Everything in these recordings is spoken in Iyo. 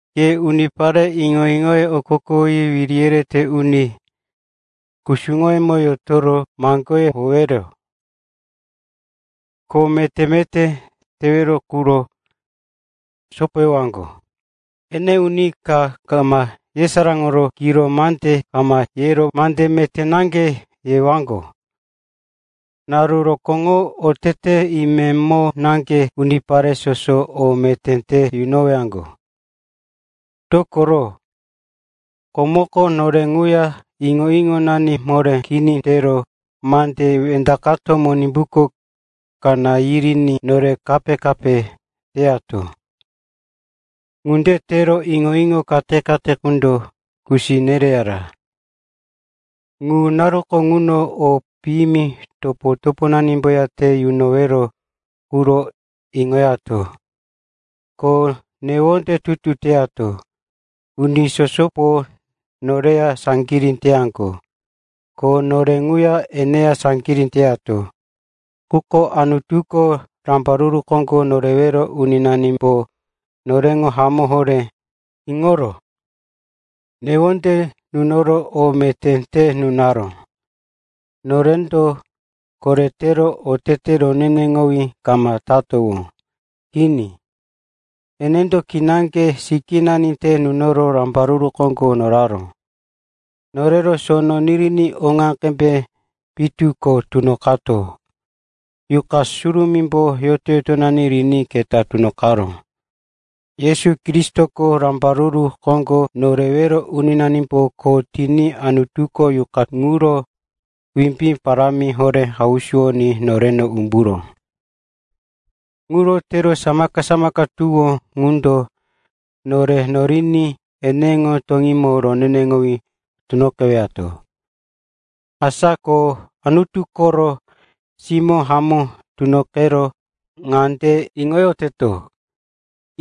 Ke unipare iŋo-iŋoye okokowoyi wiri yerete uni kusuŋoyemo yotoro maŋgoye howero, kho meté-meté tewero ŋuro sopoyowaŋgo. Ene uni ka kama yesaráŋoro kiro mande kama yero mande meté naŋge yewaŋgo. Naru rokóŋo otete imemo naŋge unipare soso o meté te yunowaŋgo. Dokoro komoko nore ŋuya iŋo-iŋonani moré kini tero mande wendaqato Monimbuko kaná yiriní nore kape-kape teyato. Ŋunde tero iŋo-iŋo kate-kate qundo kusi nereyara. Ŋu naruko ŋuno o piyimi topo-toponanimboya te yunowero ŋuro iŋoyato, ko newonde tutu teyato. Uni sosopo noreya saŋgirí teyaŋgo ko nore ŋuya eneya saŋgirí teyato. Quko Anutuko, Rambaruru Koŋgo Norewero Uninanimbo noreŋo hamó horé iŋoro, newonde nunoro, o meté te nunaró. Norendo koretero otete roneneŋowí kama tatowó. Kini, enendo kinaŋge sikínani te nunoro rambaruru koŋgo noraró. Norero sono niriní oŋa qembe pitu ko tunoqato Yuqa Surumímbo yoto-yotonani riní keta tunoqaró. Yesu Kristoko, Rambaruru Koŋgo Norewero Uninanimbo kho tiní Anutuko Yuqa ŋuro wimbí parámi horé hausuwoní noreno umburó. Ŋuro tero samaka-samaka tuwó ŋundo nore noriní eneŋo toŋímo roneneŋowí tunoqewato. Asa ko Anutu koro simó hamó tunoqero ŋande iŋoyoteto,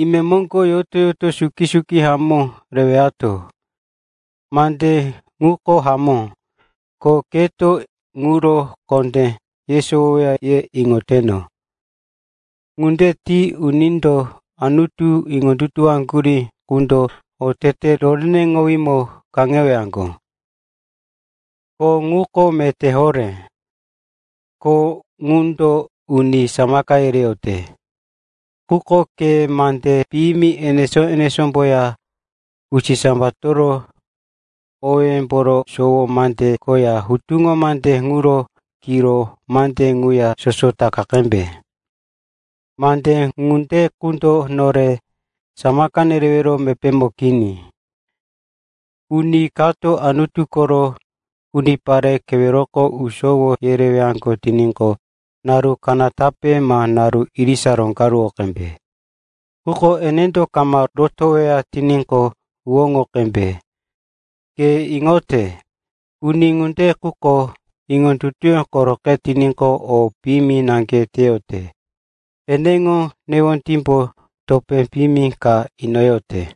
imemoŋgo yoto-yoto suki-suki hamó rewato. Mande ŋuko hamó, ko keto ŋuro kondé yesowoweya ye iŋoteno. Ŋunde ti unindo Anutu iŋondutuwoyaŋgurí qundo otete roneneŋowímo kaŋewaŋgo. Kho ŋuko meté horé ko ŋundo uni samaka yereyote. Quko ke mande piyimi enesó-enesómboya usisambatoro owéyemboro sowo mande koya hutuŋo mande ŋuro kiro mande ŋuya soso taka qembe. Mande ŋunde qundo nore samaka nerewero mepémo kini. Uni kato Anutu koro unipare keweroko usowo yerewaŋgo tiníqo, naru kanatape ma naru irisa roŋgaruwo qembe. Quko enendo kama rotoweya tiníqo, huwóŋo qembe. Ke iŋote, uni ŋunde quko iŋondutuyó koroqe tiníqo, o piyimi naŋge teyote. Eneŋo newondímbo topé piyimi ka inoyote.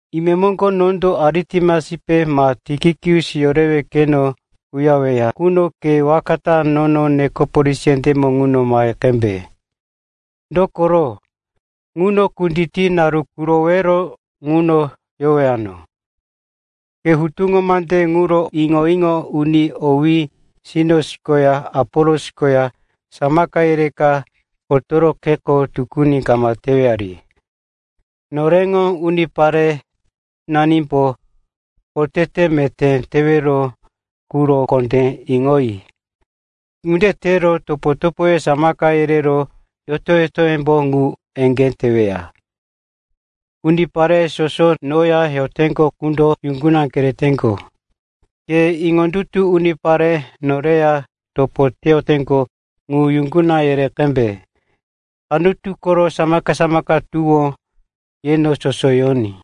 Imemoŋgo nondo Aritemasipe ma Tikikus yorewe keno uyareweya quno ke waka ta nono Nikopolis yendémo ŋuno mahe qembe. Dokoro ŋuno kutiti naru qurowore ŋuno yowano. Ke hutuŋo mande ŋuro iŋo-iŋo uni owí Sinos koya Apolos koya samaka yereka otoro kheko tukuni kama tewari. Noreŋo uniparenanimbo otete meté tewero quro kondé iŋoyi. Ŋunde tero topo-topoye samaka yerero yoto-yotoyembo ŋu eŋgé teweya. Unipare soso noya yoteŋgo qundo yuŋguna kereteŋgo. Keto iŋondutu unipare noreya topo teyoteŋgo ŋu yuŋguna yere qembe. Anutu koro samaka-samaka tuwó yeno soso yoní.